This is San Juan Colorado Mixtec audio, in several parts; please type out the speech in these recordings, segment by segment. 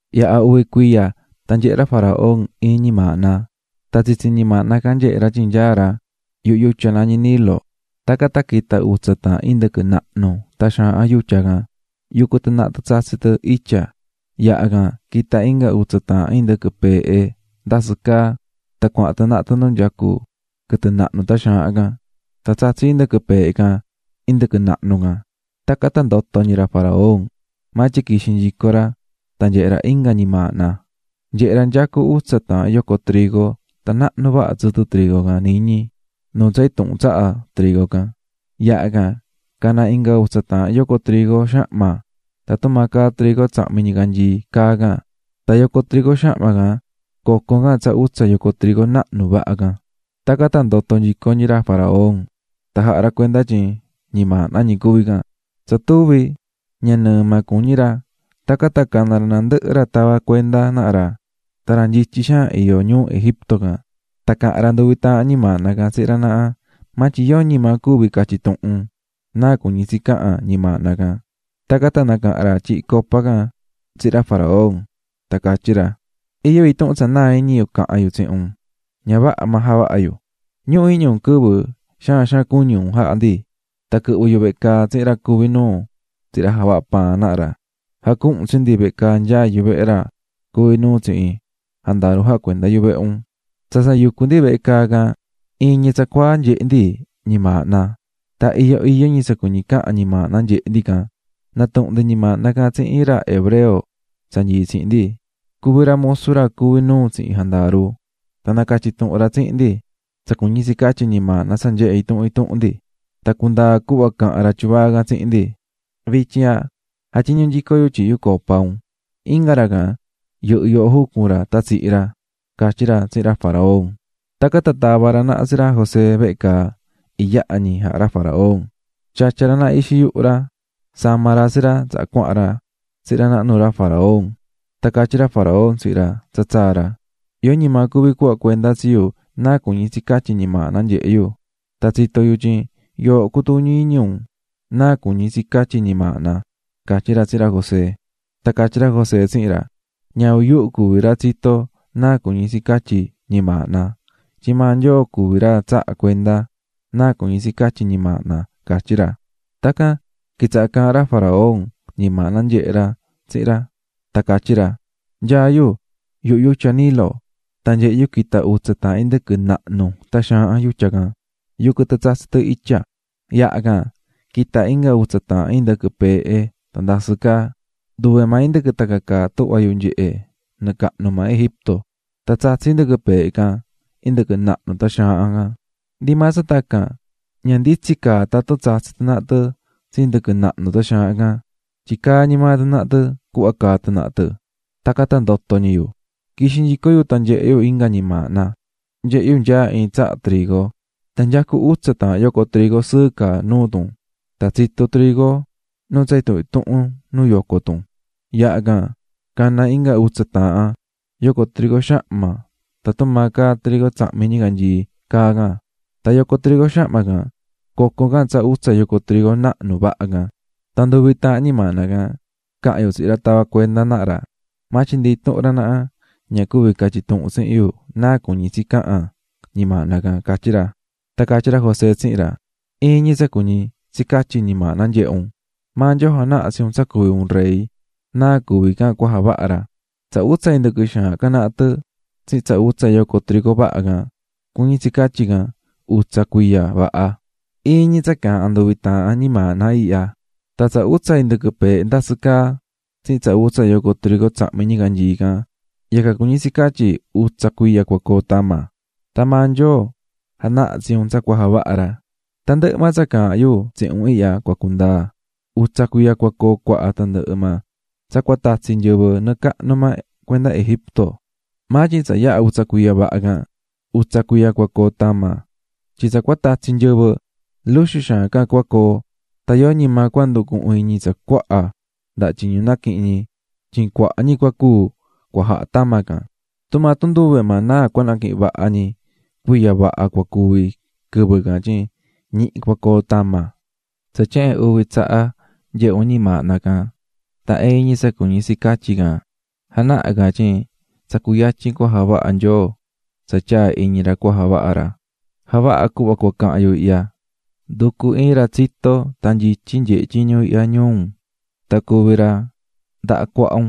Yaha̱ uvi cuiya, tan nyehe̱ ra faraón iin ñimaahna. Tan tsitsi ñimaahna can nyehe̱ ra tyin nyaá ra yuhu yutya nañí Nilo, tacan tan quita̱ utsa taahan indɨquɨ nahnu tan xaahan yutya can, yucú tɨ tsatsí tɨ itya. Yaha can, quita̱ inga utsa taahan indɨquɨ peehe ndasɨ caá tan cuahan tɨ naha tɨ nu nyacú quɨtɨ nahnu tan xaahan can. Tan tsatsi̱ indɨquɨ peehe can indɨquɨ nahnu can. Tacan tan ndoto̱ ñi ra faraón, maa tyin quixi̱ nyico ra tan nyehe̱ ra inga ñimaahna: Nyehe̱ ra nyacú utsa taahan yoco trigo tan nahnu vaha tsɨtɨ trigo can iñí nuu tsa intuhun tsaha trigo can. Yaha can, cana̱ inga utsa taahan yoco trigo xahma tan tumaa caá trigo tsahmi̱ ñicanyii caá can, tan yoco trigo xahma can coco̱ can tsa utsa yoco trigo nahnu vaha can. Tacan tan ndoto̱ nyico ra faraón, tan jaha̱ ra cuenda tyin ñimaahna ñi cuví can. Tsa tuvi̱, ña nɨɨ maa cuñí ra, tacan tan cana̱ ra nandɨhɨ ra tavá cuenda naha ra tan ra nyityi xaan iyó ñuu Egipto can. Tan caha̱n ra nduvi taahan ñimaahna can tsihin ra naha, maa tyin yoñi maa cuvi̱ catyi̱ tuhun náa cuñí tsi cahan ñimaahna can. Tacan tan nacaha̱n ra tyihí copa can tsihin ra faraón tan catyí ra: --Iyó intuhun tsa naa̱ iñi yu cahan yu tsihin un ña vaha maa javaha̱ yu. Ñuhu iñi un quɨvɨ xaan xaan cuñi̱ un jaha̱ ndi, tan quɨhvɨ̱ yu vehe caa tsihin ra cuvi̱ nuu tsihin ra javahá paan naha ra, jacuhu̱n un tsi ndi vehe caa nyaá yuvehe ra cuvi nuu tsihin jandaru jacuendá yuvehe un. Tsa tsa yucú ndi vehe caa can, iin ñi tsacuaa nyehe̱ ndi ñimaahna, tan iyó iyó ñi tsa cuñí tsi cahan ñimaahna nyehe̱ ndi can. Natuhu̱n ndi ñimaahna can tsihin iin ra hebreo tsa nyií tsihin ndi. Cuví ra musu ra cuví nuu tsihin jandaru, tan nacatyi̱ tuhun ra tsihin ndi tsa cuñí tsi catyí ñimaahna tsa nyehe̱ intuhun intuhun ndi. Tan cundaa̱ cuhva caha̱n ra tyuvaa can tsihin ndi, vityin ihya jatyiñú nyico yu tyihí yu copa un, inga ra can yɨhɨ̱ yoho jucun ra tan tsihi̱ ra --catyí ra tsihin ra faraón. Tacan tan tava̱ ra naha tsi ra José vehe caa iyaha ñi jaha̱ ra faraón. Xatya̱ ra ixi yuhu ra sama̱ ra tsi ra tsaha cuahan ra tsihin ra naha nuu ra faraón. Tan catyí ra faraón tsihin ra tsa tsaa̱ ra: --Yoñi maa cuví cuhva cuenda tsi yu náa cuñí tsi catyí ñimaahna nyehe̱ yu, tan tsito̱ yu tyin yooho cutuñí iñi un náa cuñí tsi catyí ñimaahna --catyí ra tsihin ra José. Tan catyí ra José tsihin ra: --Ñavin yuhu cuví ra tsitó náa cuñí tsi catyí ñimaahna, tyin maa Nyoo cuví ra tsahá cuenda náa cuñí tsi catyí ñimaahna --catyí ra. Tacan tan quitsaha̱ caahán ra faraón ñimaahna nyehe̱ ra tsihin ra, tan catyí ra: -- Nyaá yu yuhu yutya Nilo, tan nyehe̱ yu quita̱ utsa taahan indɨquɨ nahnu tan xaahan yutya can, yucú tɨ tsatsí tɨ itya. Yaha can, quita̱ inga utsa taahan indɨquɨ peehe tan ndasɨ́ caá. ¡Nduve maa indɨquɨ tacan caá tuhva yu nyehé nɨɨ cahnu maa Egipto! Tan tsatsi̱ indɨquɨ peehe can indɨquɨ nahnu tan xaahan can. Ndi maa tacan ña nditsin caa tatun tsatsi̱ tɨ naha tɨ tsi indɨquɨ nahnu tan xaahan can, tyin caá ñi maa tɨ naha tɨ cuhva caá tɨ naha tɨ. Tacan tan ndoto̱ ñi yu. "Quixi̱ nyico yu tan nyehe̱ yu inga ñimaahna: Nyehe̱ yu nyaá iin tsaha trigo tan nyacú utsa taahan yoco trigo sɨɨ caá nuu tun, tan tsitu̱ trigo nu tsa intuhun intuhun nu yoco tun. Yaha can, cana̱ inga utsa taahan yoco trigo xahma tan tumaa caá trigo tsahmi̱ ñicanyii caá can. Tan yoco trigo xahma can coco̱ can tsa utsa yoco trigo nahnu vaha can. Tan nduvi taahan ñimaahna ihya caha̱n yu tsihin ra tavá cuenda naha ra, maa tyin ndi intuhun ra naha ña cuvi̱ catyi tuhun tsihin yu náa cuñí tsi cahan ñimaahna ihya --catyí ra. Tan catyí ra José tsihin ra: --Iin ñi tsa cuñí tsi catyí ñimaahna nyehe̱ un. Maa Nyoo janaha̱ tsi un tsa cuví un rey náa cuvi can cua javaha ra. Tsa utsa indɨquɨ xaahan can naha tɨ tsihin tsa utsa yoco trigo vaha can, cuñí tsi catyi can utsa cuiya vaha, iin ñi tsa caahán nduvi taahan ñimaahna ihya. Tan tsa utsa indɨquɨ peehe ndasɨ́ caá tsihin tsa utsa yoco trigo xahma tsahmi̱ ñicanyii can, yacan cuñí tsi catyí utsa cuiya cua coo tama. Tan maa Nyoo janaha̱ tsi un tsa cua javaha ra. Tandɨhɨ maa tsa caahán yu tsihin un ihya cua cundaa. Utsa cuiya cua coo cuaha tandɨhɨ maa tsa cua tatsi nyɨvɨ nɨɨ cahnu maa cuenda Egipto ihya. Maa tyin tsa yaha utsa cuiya vaha can, utsa cuiya cua coo tama, tyin tsa cua tatsi nyɨvɨ luxu xaan can cua coo tan yoñi maa cua nducuhun iñi tsa cuaha ndaha tyiñu naquihi̱n ñi tyin cuaha ñi cua cúu cua jaha tama can. Tumaa tun nduve maa naa cua naquihin vaha ñi cuiya vaha cua cuvi quɨvɨ can tyin ñihi cua coo tama. Tsa tyehen uvi tsaha nyehe̱ un ñimaahna can tan iin ñi tsa cuñí tsi catyí can janahá can tyin tsa cuyatyin cua javaha Nyoo tsa tyaa̱ iñi ra cua javaha ra. "Ja̱vaha cuhva cua cahan yu ihya, ndu̱cu iin ra tsitó tan nyityi nyehe tyiñu ihya ñuu un tan cuvi ra ndaha cuaha un.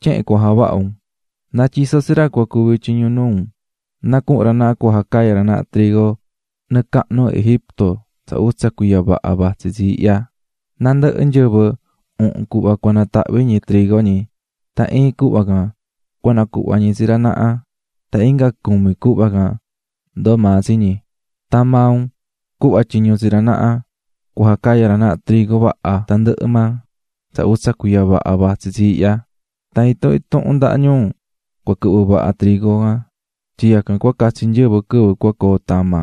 Tyehen cua javaha un: Na̱tyiso tsi ra cua cuvi tyiñu nuu un na cuhun ra naha cua jacaya ra naha trigo nɨɨ cahnu Egipto tsa utsa cuiya vaha vatsí tsi ihya, nandɨhɨ nyɨvɨ uhun cuhva cua natahvi ñi trigo ñi tan iin cuhva can cua nacuhva ñi tsi ra naha tan inga cumi cuhva can ndoo maa tsi ñi. Tan maa un cuhva tyiñu tsi ra naha cua jacaya ra naha trigo vaha tandɨhɨ maa tsa utsa cuiya vaha vatsi tsi ihya, tan intuhun intuhun ndaha ñuu cua quɨhvɨ vaha trigo can tyin yacan cua catsi nyɨvɨ quɨvɨ cua coo tama.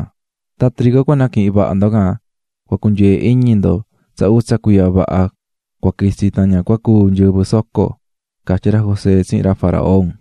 Tan trigo cua naquihin vaha ndo can cua cunyee iñi ndo tsa utsa cuiya ña vaha cua quitsi tan ña cúu nyɨvɨ soco --catyí ra José tsihin ra faraón.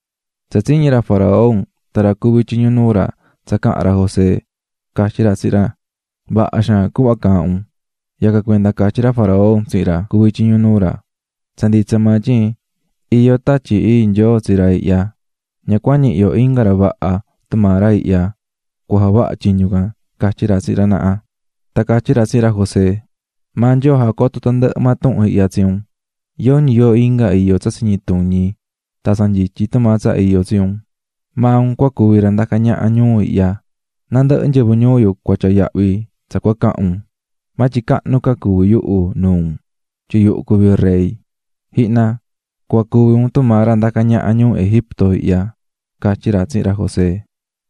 Tsa tsiñi̱ ra faraón tan ra cuví tyiñu nuu ra tsa caha̱n ra José, catyí ra tsihin ra: ―Vaha xaan cuhva caahán un. Yacan cuenda catyí ra faraón tsihin ra cuví tyiñu nuu ra: --Tsa nditsa maa tyin iyó tatyi ii Nyoo tsihin ra ihya, ña cua ñihi yo inga ra vaha tumaa ra ihya cua javaha tyiñu can --catyí ra tsihin ra naha. Tan catyí ra tsihin ra José: --Maa Nyoo jacoto̱ tandɨhɨ maa tuhun ihya tsi un, yoñi yoo inga iyó tsa tsiñituñi tan tsa nyityi tumaa tsa iyó tsi un. Maa un cua cuvi ra ndacá ñaha ñuu ihya, nandɨhɨ nyɨvɨ ñuu yu cua tyaa yahvi tsa cua cahan un, maa tyin cahnu ca cuví yuhu nuu un tyin yuhu cuví rey. Ji̱hna, cua cuvi un tumaa ra ndacá ñaha ñuu Egipto ihya --catyí ra tsihin ra José.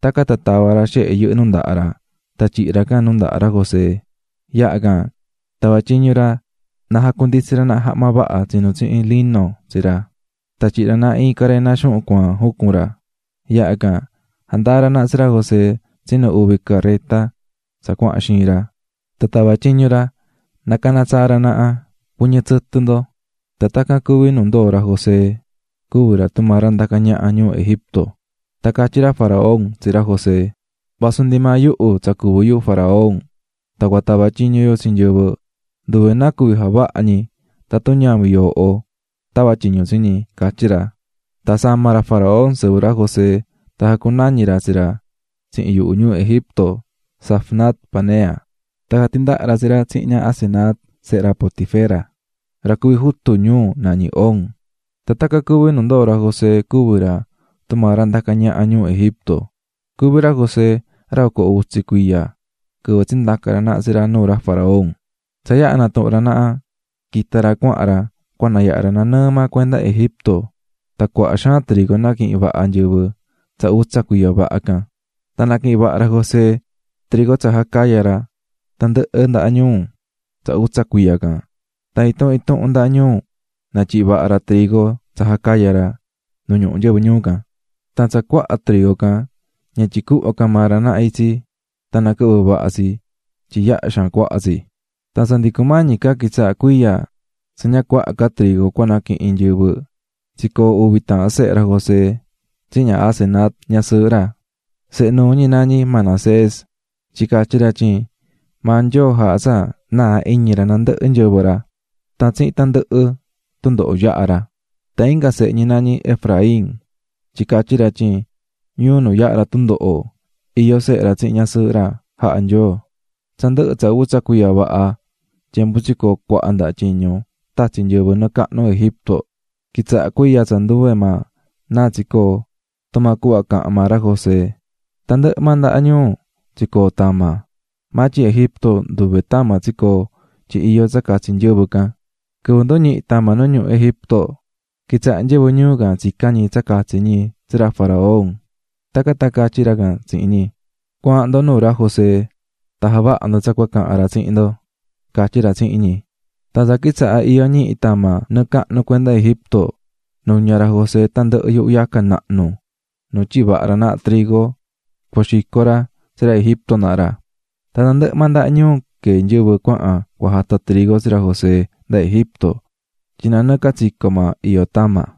Tacan tan tava̱ ra xehe yɨhɨ́ nu ndaha ra tan tyihi̱ ra can nu ndaha ra José. Yaha can, tava̱ tyiñu ra na jacunditsi ra naha jahma vaha tsinu̱ tsihin lino tsi ra, tan tyihi̱ ra naha iin carena xuhun cuaan jucun ra. Yaha can jandaa̱ ra tsi ra José tsinu uvi careta tsa cuahan xiin ra. Tan tava̱ tyiñu ra na cana tsaa ra naha: "¡Cu̱ɨñɨ tsɨtɨ ndo!" Tan tacan cuví nu ndoo̱ ra José cuví ra tumaa ra ndacá ñaha ñuu Egipto. Tan catyí ra faraón tsihin ra José: --Vasu ndi maa yuhu tsa cuví yu faraón tan cua tava tyiñu yu tsi nyɨvɨ, nduve náa cuví javaha ñi tatun ñavin yooho tavá tyiñu tsi ñi --catyí ra. Tan sama̱ ra faraón sɨvɨ ra José tan jacunañi̱ ra tsi ra tsihin yuhu ñuu Egipto Zafnat-panea. Tan jatindaha̱ ra tsi ra tsihin ña Asenat sehe ra Potifera, ra cuví jutu ñuu nañí On. Tan tacan cuví nu ndoo̱ ra José cuví ra tumaa ra ndacá ñaha ñuu Egipto. Cuví ra José, ra oco utsi cuiya quɨvɨ tsindaca̱ ra naha tsi ra nuu ra faraón. Tsa yaha̱ natuhu̱n ra naha, quita̱ ra cuahan ra cua nayaha ra nanɨɨ maa cuenda Egipto. Tan cuaha xaan trigo naquihi̱n vaha nyɨvɨ tsa utsa cuiya vaha can. Tan naquihi̱n vaha ra José trigo tsa jacaya̱ ra tandɨhɨ ndaha ñuu tsa utsa cuiya can, tan intuhun intuhun ndaha ñuu natyihi̱ vaha ra trigo tsa jacaya̱ ra nu ñuhu nyɨvɨ ñuu can. Tan tsa cuaha trigo can ña tyicuhvá ca maa ra naha itsi tan naquɨhvɨ́ vaha tsi tyin yaha xaan cuaha tsi. Tsa ndi cumañi ca quitsaha cuiya tsa ña cuaha ca trigo cua naquihin nyɨvɨ, tsicoo̱ uvi taahan sehe ra José tsihin ña Asenat, ñasɨɨhɨ ra. Sehe nuu ñi nañí Manasés, tyin catyí ra tyin maa Nyoo jaha̱ tsa naa̱ iñi ra nandɨhɨ nyɨvɨ ra tan tsihin tandɨhɨ tundoho yaha̱ ra. Tan inga sehe ñi nañí Efraín, tyin catyí ra tyin ñuu nu yahá ra tundoho iyó sehe ra tsihin ñasɨɨhɨ ra jaha̱ Nyoo. Tsa ndɨhɨ̱ tsa utsa cuiya vaha tyembu tsicoo̱ cuaha ndaha tyiñu tatsi̱ nyɨvɨ nɨɨ cahnu Egipto, quitsaha̱ cuiya tsa nduve maa náa tsicoó, tumaa cuhva caha̱n maa ra José. Tandɨhɨ maa ndaha ñuu tsicoo̱ tama, maa tyin Egipto nduve tama tsicoo̱ tyin iyó tsa catsi nyɨvɨ can. Quɨvɨ nduñihi̱ tama nu ñuhu Egipto, quitsaha̱ nyɨvɨ ñuu can tsicán ñi tsa catsi ñi tsi ra faraón. Tacan tan catyí ra can tsihin ñi: "Cua̱ahan ndo nu nyaá ra José tan javaha ndo tsa cua cahan ra tsihin ndo", catyí ra tsihin ñi. Tan tsa quitsaha̱ iyó ñihi tama nɨɨ cahnu cuenda Egipto, nuña̱ ra José tandɨhɨ yuhu yaca nahnu nu tyihi̱ vaha ra naha trigo cua xico ra tsi ra Egipto naha ra. Tandɨhɨ maa ndaha ñuu queé nyɨvɨ cuahan cua jata trigo nu nyaá ra José, tyin nanɨɨ catsico maa iyó tama.